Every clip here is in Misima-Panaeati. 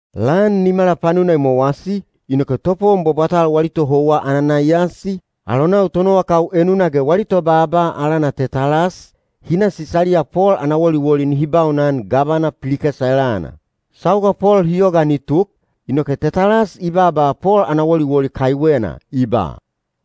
Lan nimala panuna i mowasi, inoke topowon bwabwatal wali tohouwa Ananaiyasi, alonau tonowakau enuna ge wali tobaaba alana Tetalas, hi na Sisaliya Pol ana woliwoli nihi baunan gavana Pilikesa elana. Sauga Pol hi yogaan i tuk, inoke Tetalas i baaba Pol ana woliwoli kaiwena, i ba,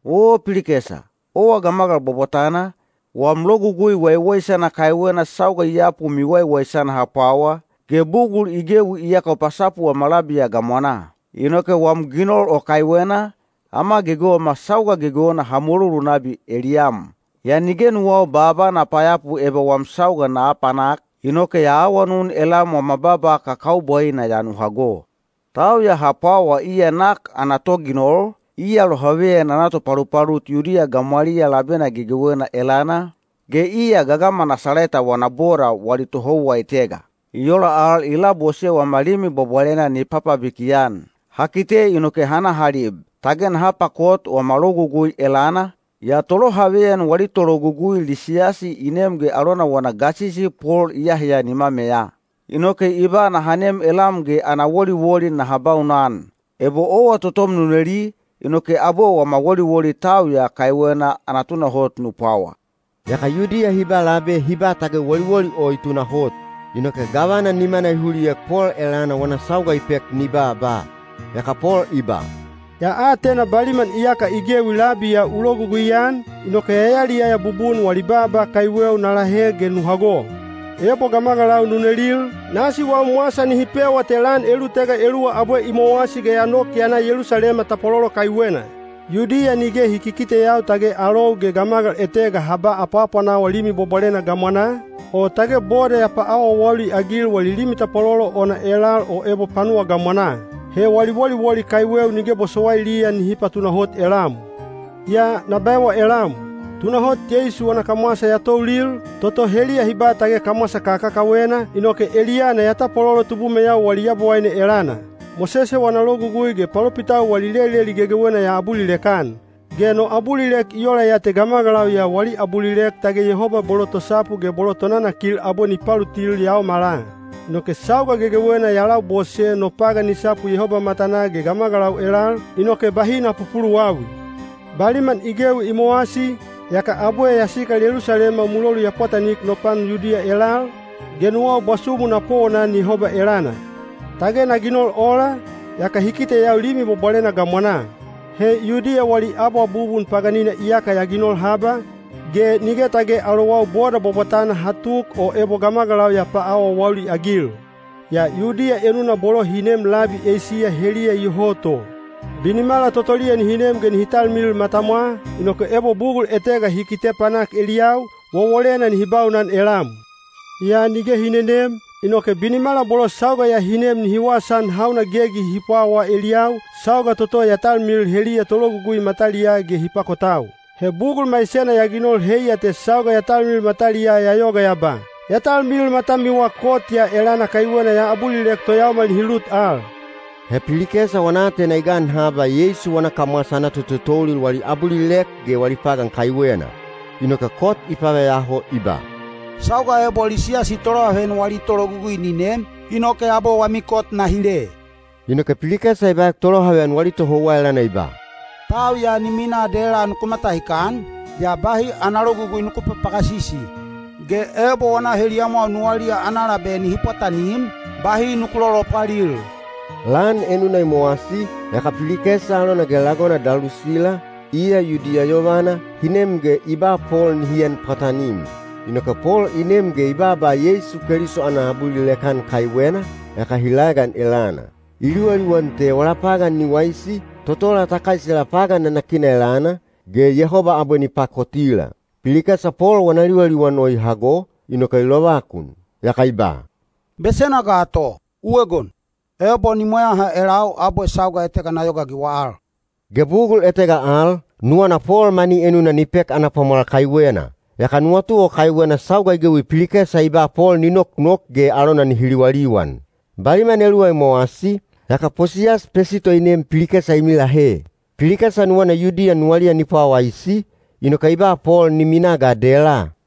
“Oo Pilikesa, owa gamagal bwabwatana, wam logugui waiwaisana kaiwena sauga i yapu miwaiwaisana ha pwawa, ge bugul i gewi iyaka u pasapu wama labi ya gamwanaa. Inoke wam ginol o kaiwena, ama gegewema sauga gegewena ha mulolu nabi eliyam. Yaa nige nuwau baaba na payapu eba wam sauga na apanak, inoke ya awanun elam wama baaba kakaubwaina ya nu hago. “Tau ya ha pwawa iya nak ana toginol, iya lohaveyan ana topalupalut Yudiya gamwaliyaa labena gegewena elana, ge iya gagama Nasaleta wana boda wali tohouwa etega. I ola al i labose wama Limi Bwabwalena ni papabiki-an. Ha kite inoke ha na ha lib. Tage naha pakot wama Logugui elana, yaa tolohaveyan wali tologugui Lisiyasi i nem ge alona wana gasisi Pol i aheya nimameya. Inoke i ba naha nem elam ge ana woliwoli naha baunan. Ebo owa totom nu neli, inoke abwe wama woliwoli tau ya kaiwena ana tunahot nu pwawa.” Yaka Yudiya hi ba labe hi ba tage woliwoli o i tunahot. Inoke gavana nimana i huliek Pol elana wana sauga i pek ni baaba. Yaka Pol i ba, “Ya atena baliman iyaka i gewi labi ya u logugui-an, inoke ya yaliyaya bubun wali baaba kaiweu na lahe ge nu hago. Ebo gamagalau nu nelil, nasi wam wasa nihi pewa te lan elulutega eluwa abwe i mowasi ge ya nok ya na Yelusalema tapwalolo kaiwena. Yudiya nige hi kikiteyau tage alou ge gamagal etega ha ba apwaapwanawa Limi Bwabwalena gamwanaa, o tage boda ya paawaawauli-agil wali limi tapwalolo ona elal o ebo panuwa gamwanaa. He wali woliwoli kaiweu nige bosowailiya nihi patunahot elam. Yaa na baewa elam, tunahot Yeisu wana kamwasa ya toulil, toto heliya hi ba tage kamwasa kakakawena, inoke eliyana ya tapwalolo tubumeyau wali Yabowaine elana. Mosese wana Logugui ge palopitau wali leleli gegewena ya abulilek-an. Ge no abulilek i ola ya te gamagalau ya wali abulilek tage Yehoba bolo tosapu ge bolo tonanakil abwe ni palutil yaomala. Inoke sauga gegewena ya labose no pagan ni sapu Yehoba matanaa ge gamagalau elal, inoke bahi na pupuluwawi. “Baliman i gewi i mowasi, yaka abwe ya sikal Yelusalema mulolu ya pwatanik no pan Yudiya elal, ge nuwau bwasumu na powonan Yehoba elana. Tage na ginol ola, yaka hi kiteyau Limi Bwabwalena gamwanaa. He Yudiya wali abwabubun paganina iyaka ya ginol haba, ge nige tage alowau boda bwabwatana ha tuk o ebo gamagalau ya paawaawauli-agil. Yaa Yudiya enuna bolo hi neem labi Eisiya heliya iyoho to. Binimala totoliya nihi nem ge nihi talmilil matamwa, inoke ebo bugul etega hi kite panak eliyau, wowolena nihi baunan elam. Yaa nige hi nenem, inoke binimala bolo sauga ya hi nem nihi wasaan hauna gegi hi pwawa eliyau, sauga toto ya talmilil heliya tologugui mataliyaa ge hi pakotau. He bugul maisena ya ginol heiya te sauga ya talmilil mataliyaa ya yoga ya ba, ‘Ya talmilil matamiwa kot ya elana kaiwena ya abulilek toyaomal nihi lut al.’” He Pilikesa wana aatena i gan haba Yeisu wana kamwasa ana totoulil wali abulilek ge wali pagan kaiwena. Inoke kot i paveyaho i ba, “Sauga ebo Lisiyasi tolohaveyan wali tologugui ni nem, inoke abwe wami kot na hile.” Inoke Pilikesa i baek tolohaveyan wali tohouwa elana i ba, “Tau ya ni minaa dela nuku matahikan, yaa bahi ana logugui nuku papagasisi. Ge ebo wana heliyamwau nuwaliya ana labe nihi pwatanim, bahi nuku lolopwalil.” Lan enuna i mowasi, yaka Pilikesa alona ge lagona Dalusila, iya Yudiya yovana, hi nem ge i ba Pol nihi en pwatanim. Inoke Pol i nem ge i baaba Yeisu Keliso ana abulilek-an kaiwena, yaka hi laegan elana. I liwaliwan te wala pagan ni waisi, totola ta kaisela pagan nanakina elana, ge Yehoba abwe ni pakotila. Pilikesa Pol wana liwaliwan o i hago, inoke i lovakun. Yaka i ba, “Besena ga to! U egon. Ebo ni mweyaha elau abwe sauga etega na yogaagiwa al.” Ge bugul etega al, nuwana Pol mani enuna ni pek ana pwamwal kaiwena. Yaka nuwatu o kaiwena sauga i gewi Pilikesa i ba Pol ni noknok ge alona nihi liwaliwan. Baliman eluwa i mowasi, yaka Posiyas Pesito i nem Pilikesa i milahe. Pilikesa nuwana Yudiya nuwaliya ni pwawaisi, inoke i ba Pol ni minaa ga dela.